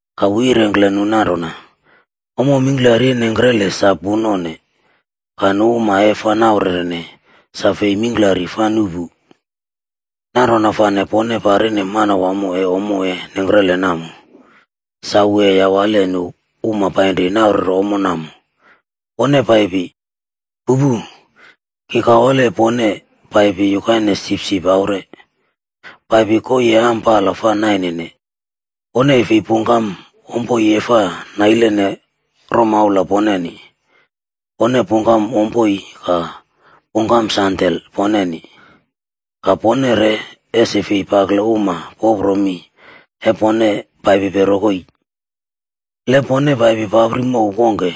Ka wu yirengkle nu nanrona, “Ommo mingklari e nengkrele sa punone pu, ka nu uma e fa naurerene, sa fei mingklari fa nuꞌpu. Nanrona fane pone parine Manawamo e ommo e nengkrele namo, sa wu e yawale nu uma painri naurere ommo woneni. Pone paipi! Pupu, ki kawale pone paipi yukaine sipsip aure,a paipi koii e ampala fa nainene. Pone e fi pungkam ommo e fa nailene romaula poneni, pone pungkam ompoi ka pungkam sandel poneni. Ka pone re ese fei pakle uma popro mi e pone paipipe rokoi. “Le pone paipi papri mow wongke,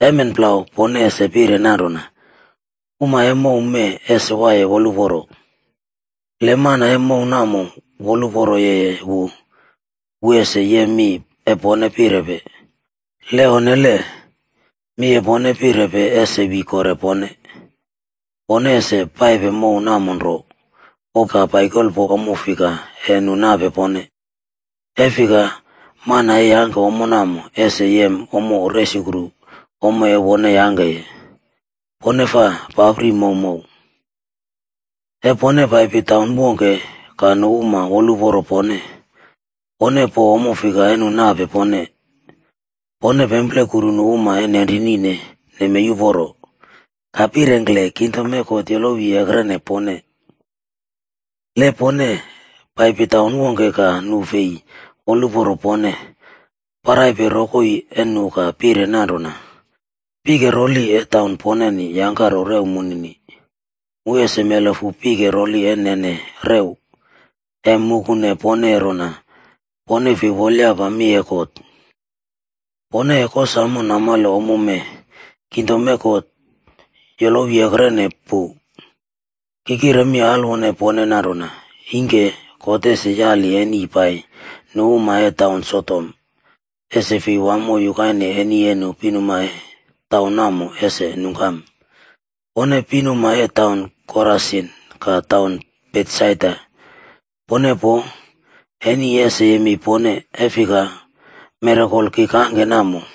emen plau pone ese pire nanrona, ‘Uma e mow mee ese waiye woluporo!’ Le mana e mow namo woluporo yeye wu, wu ese yem mi e pone pirepe. Le onnele, mi e pone pirepe ese wi kore pone. Pone ese paipe mow namo nro, po ka paikolpo ommo fika e nu nape pone, e fika mana e yangke ommo namo ese yem ommo resukru ommo e wone yangkeye. Pone fa papri mowmow. “E pone paipi taun wongke ka nu uma woluporo pone, pone po ommo fika e nu nape pone. Pone pemplekuru nu uma e nenrinine nemei uporo, ka pirengkle, ‘Kingdom e God yolowi ekrene pone.’ Le pone paipi taun wongke ka nu fi woluporo pone, paraipe rokoi e nu ka pire nanrona, ‘Pike roli e taun poneni yangkaro rew munini, mu ese melefu pike roli e nenene rew, e mukune pone rona pone fei wolyapa mi e God. Pone e kosamo namale ommo mee, kingdom e God yolowi ekrene pu.’ Ki kire mi alwone pone nanrona, ingke God ese yali eni pai nu uma e taun Sodom,b ese fi wamo yukaine eni e nu pinuma e taun namo ese nungkam. “Pone pinuma e taun Korasin ka taun Betsaida,c pone poo, eni ese yemei pone. E fika, mirakol ki kangke namo,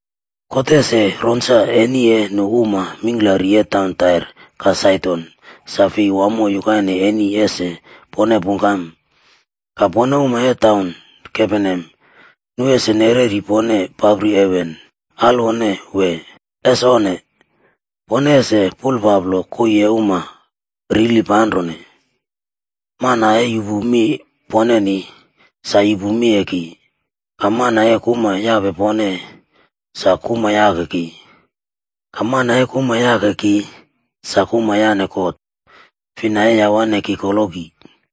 God ese roinsa eni e nu uma mingklari e taun Tair ka Saidon sa fei wamo yukaine eni ese pone pungkam. Ka pone uma e taun Kaperneam, nu ese nereri pone papri heven, alwone wee? Es onne! Pone ese paplo koii e uma rili panrone. “Mana e yupu mi poneni, sa yupu mi e ki, ka mana e kuma yape pone, sa kuma yake ki. Ka mana e kuma yake ki, sa kuma yaꞌne God, fina e yawane ki koloki.”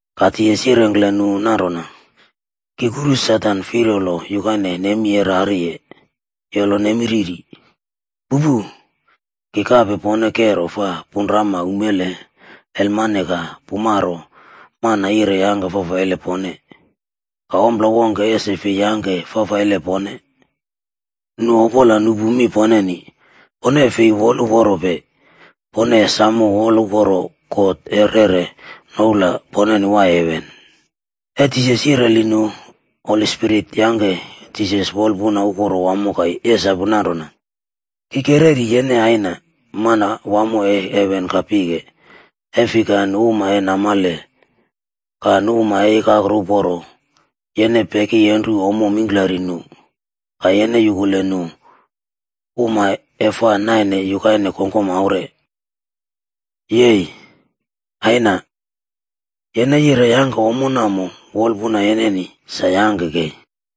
Ka Jisas yirengkle nu nanrona, “Ki kuru Satan firyolo yukaine nemi e rariye, yolo nemi riri. Pupu. Ki kape pone kero fa punrama umele, elmane, ka pumaro mana yire yangke fafaile pone, ka ompla wongke ese fei yangke fafaile pone. Nu opola nupu mi poneni, pone fi woluporope, pone e samo woluporo God e reꞌre noula poneni waiye heven.” E Jisas yireli nu, Holi Spirit yangke Jisas wolpuna uporo wamo ka yesapu nanrona, “Ki kereri yene Aina, Manawamo e heven ka pike, e fika nu uma e namale ka nu uma e ikakro uporo, yene pekyenru ommo mingklari nu, ka yene yukule nu uma e fa naine yukaine kongkom aure. Yei! Aina. Yene yire yangke ommo namo wolpuna yeneni, sa yangke kei.”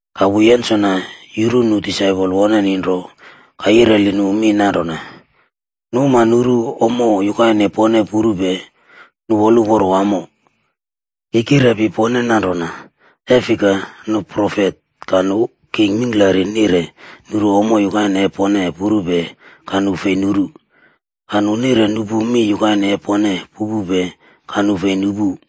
Ka wu yensona yuru nu disaipol woneni nro ka yireli nu mi nanrona, “Nu uma nuru ommo yukaine pone purupe, nu woluporo wamo. Ki kirepi pone nanrona, e fika, nu profet ka nu king mingklari nire nuru ommo yukaine e pone purupe ka nu fi nuru. Ka nu nire nupu mi yukaine e pone pupupe ka nu fi nupu.”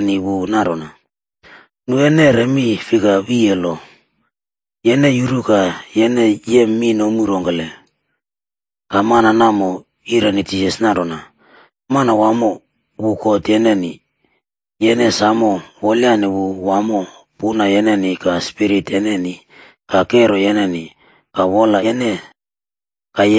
Ka Jisas yireni wu nanrona, “Nu e neꞌre mi fika wiye lo? Yene yuru ka yene yem mi nomu rongkele?” Ka mana namo yireni Jisas nanrona, “ ‘Manawamo wu God yene, yene e samo wolyane wu wamo puna yene ka spirit yene ka kero yene ka wola yene.’ Ka,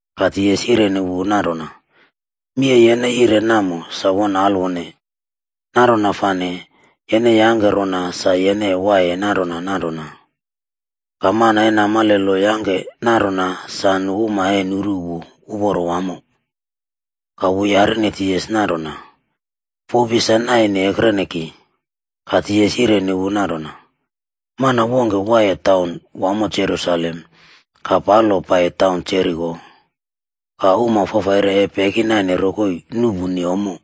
Ka Jisas yireni wu nanrona, “Mi e yene yireye namo sa won alwone. Nanrona fane, yene yangke rona sa yene e waiye nanrona nanrona.” Ka man e namale lo yangke nanrona sa nu uma e nuru wu uporo wamo, ka wu yarine Jisas nanrona, “Fopi sa naine ekrene ki?” Ka Jisas yireni wu nanrona, “Mana wongke waiye taun wamo Jerusalem ka palo pai taun Jeriko, ka uma fafaire e pekinaine rokoi nuꞌpuni ommo.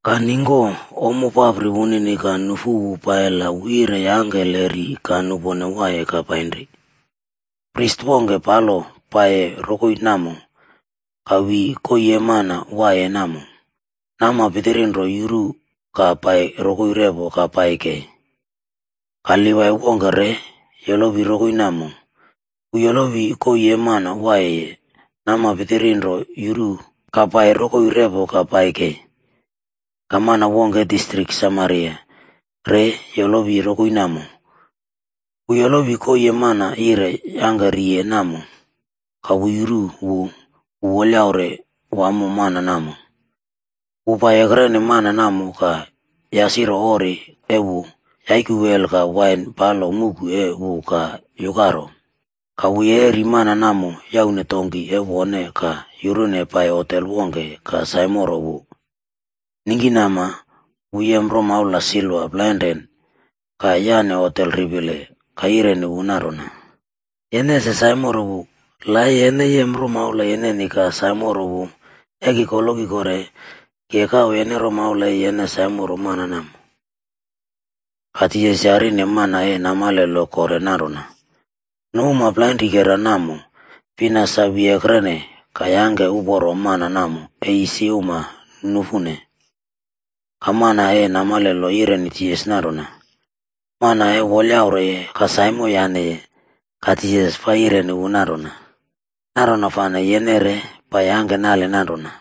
Ka ningko ommo papri wunini ka nufu wu pai la wu yire yangke le ri ka nupone waiye ka painri. Pris wongke palo paiyiye rokoi namo, ka wi koii e mana waiyeye namo, nama pitiri nro yuru ka pai rokoi repo ka pai kei. “Ka Livai wongke re yolowi rokoi namo, wu yolowi koii e mana waiyeye, nama pitiri nro yuru ka pai rokoi repo ka pai kei. Ka mana wongke e distrik Samariaf re yolowi rokoi namo, wu yolowi koii e mana yire yangke riye namo. Ka wu yuru wu, wu wolyaure wamo mana namo. Wu pai ekrene mana namo ka yasiro ori e wu, yaiku wel ka wain palo muꞌku e wu ka yukaro. Ka wu yereri mana namo ka yaune donkig e wone ka yurune pai hotel wongke ka saimoro wu. Ningkinama wu yem romaula silva plainrane ka yaꞌne hotel ripile ka yireni wu nanrona, ‘Yene ese saimoro wu. La e yene yem romaula yeneni ka saimoro wu, e ki koloki kore, ki e kawe yene romaula e yene saimoro mana namo.’” Ka Jisas yarine mana e namale lo kore nanrona, “Nu uma plainrikera namo, fina sa wi ekrene ka yangke uporo mana namo e isi uma nufune?” Ka mana e namale lo yireni Jisas nanrona, “Mana e wolyaureye ka saimo yaneye.” Ka Jisas fa yireni wu nanrona, “Nanrona fane yene re pai yangke nale nanrona.”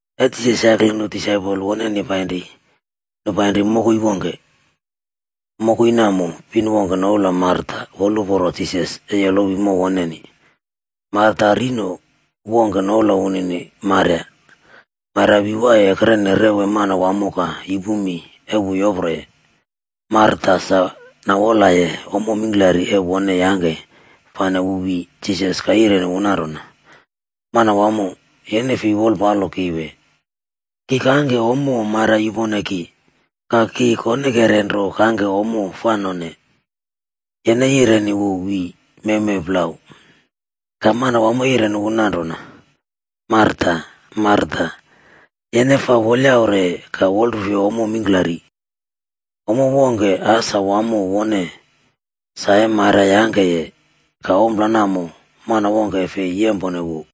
E Jisas yakle nu disaipol woneni painri, nu painri mokoi wongke. Mokoi namo pin wongke noula Marta woluporo Jisas e yolowi mow woneni. Marta rino wokera noula wunini Maria. Maria wi waiye ekrene rew e Manawamo ka yupu mi e wu yoproye. Marta sa nawolaye ommo mingklari e wone yangke fane wu wi Jisas ka yireni wu nanrona, “Manawamo, yene fei wolpalo ki wee? Ki kangke ommo Maria yupone ki, ka ki konekere nro kangke ommo fa none, yene yireni wu wi mewmew plau.” Ka Manawamo yireni wu nanrona, “Marta, Marta, yene fa wolyaure ka wolrufuye ommo mingklari. Ompla wongke asa wamo wone, sa e Maria yangkeye ka ompla namo mana wongke e fei yempone wu.”